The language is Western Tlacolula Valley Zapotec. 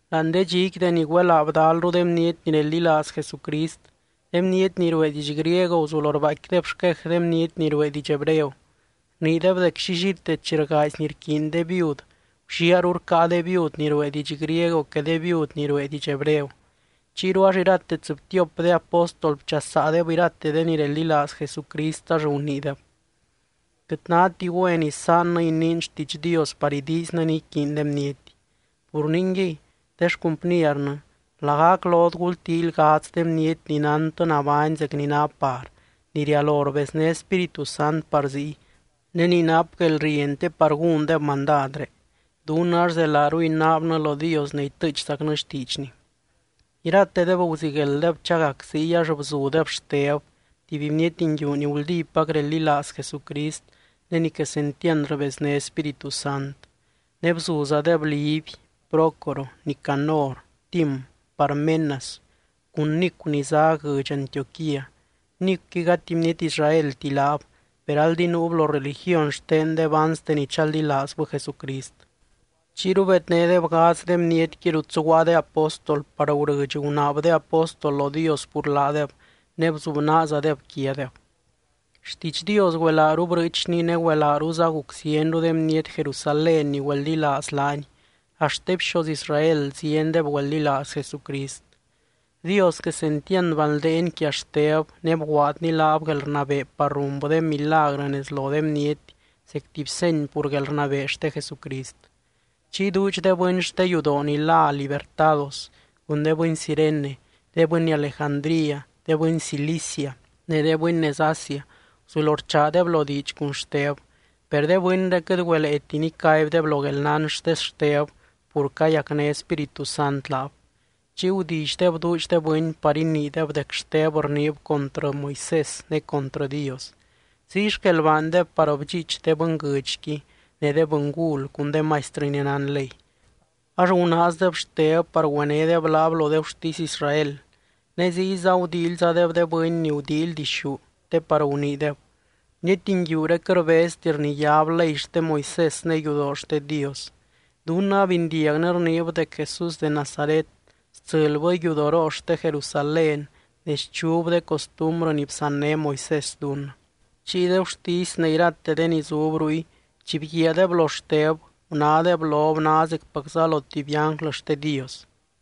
Láani de dxiqui deni güelaa bdalru de bniety ni reldilaaz Jesucrist, de bniety ni ruee diidx griego guzulo rbaaicquideb xquej de bniety ni ruee diidx hebreo. Rniideb dec llillite chi rgaazy ni iquiiny de viud, gulliaaru rcáa de viud ni ruee diidx griego que de viud ni ruee diidx hebreo. Chiyru ax irate tsɨbtiop de apóstol bchasaadeb irate de ni reldilaaz Jesucrist ax guniideb: —Quɨt náti güen isaannɨ iniin xtiidx Dios par idiiznɨ ni iquiiny de bniety. Pur ningui, de xcumpniernɨ, lagac lot gultíily gadz de bniety ni nántɨ nabány zec ni ná par, ni rialo rbezné Spíritu Sant par ziy, ne ni nap guelrieny te par gúndeb mandadré. Dunnɨ ax zelaaru inaabnɨ lo Dios ne itɨɨchzacnɨ xtiidxny. Iratedeb guziguelddeb chagac ziy ax bzudeb Xteb, tuby bniety nguiu ni guldípac reldilaaz Jesucrist ne ni quesentiand rbezné Spíritu Sant. Ne bzuzadeb Liby, Prócoro, Nicanor, Tim, Parmenas cun Nicu ni zá guɨdx Antioquía. Nicuqui gati bniety Israelti laab, per aldi nuub lo religiony xtendeb anste ni chaldilaazbɨ Jesucrist. Chiyru bednédeb gadz de bnietqui rut zuguaa de apóstol par gurɨdx gunaab de apóstol lo Dios pur laadeb ne bzubnaazadeb quiadeb. Xtiidx Dios güelaaru brɨɨchni ne güelaaruza guc zienru de bniety Jerusalén ni güeldilaaz laany, axt de bxoz Israel ziendeb güeldilaaz Jesucrist. Dios quesentiand banldeeny quia Xteb, ne bguaadny laab guelrnabee par runbɨ de milagrɨ nez lo de bniety zec tuby seny pur guelrnabee xte Jesucrist. Chiy duudx de bɨny xte yudoo ni lá Libertados, cun de bɨny Cirene, de bɨny Alejandría, de bɨny Cilicia ne de bɨny nez Asia, guzulo rchaadeb lo diidx cun Xteb. Per de bɨnré quɨt güeleeti nicaibdeb lo guelnán xte Xteb pur ni cayacné Spíritu Sant laab. Chiy gudillydeb duudx de bɨny par iniideb dec Xteb rniib contrɨ Moisés ne contrɨ Dios. Ziy xquel baandeb par bdxiich de bɨnguɨdxqui ne de bɨngul cun de maistrɨ ni nán ley. Ax gunaazdeb Xteb par güenédeb laab lo de gurtisy Israel. Ne ziyza gudíilyzadeb de bɨny ni gudíily dixú, te par guniideb: —Bniety nguiuré quɨt rbezti rniyáb ley xte Moisés ne yudoo xte Dios. Dunnɨ abindiagnɨ rniib dec Jesús de Nazaret stsɨlbɨ yudoroo xte Jerusalén ne schub de costumbrɨ ni bsanné Moisés dunnɨ. Chiy de gurtisy ne irate de ni zub ruy chi bguiaadeb lo Xteb, gunádeb lob ná zecpac lo tuby ánglɨ xte Dios.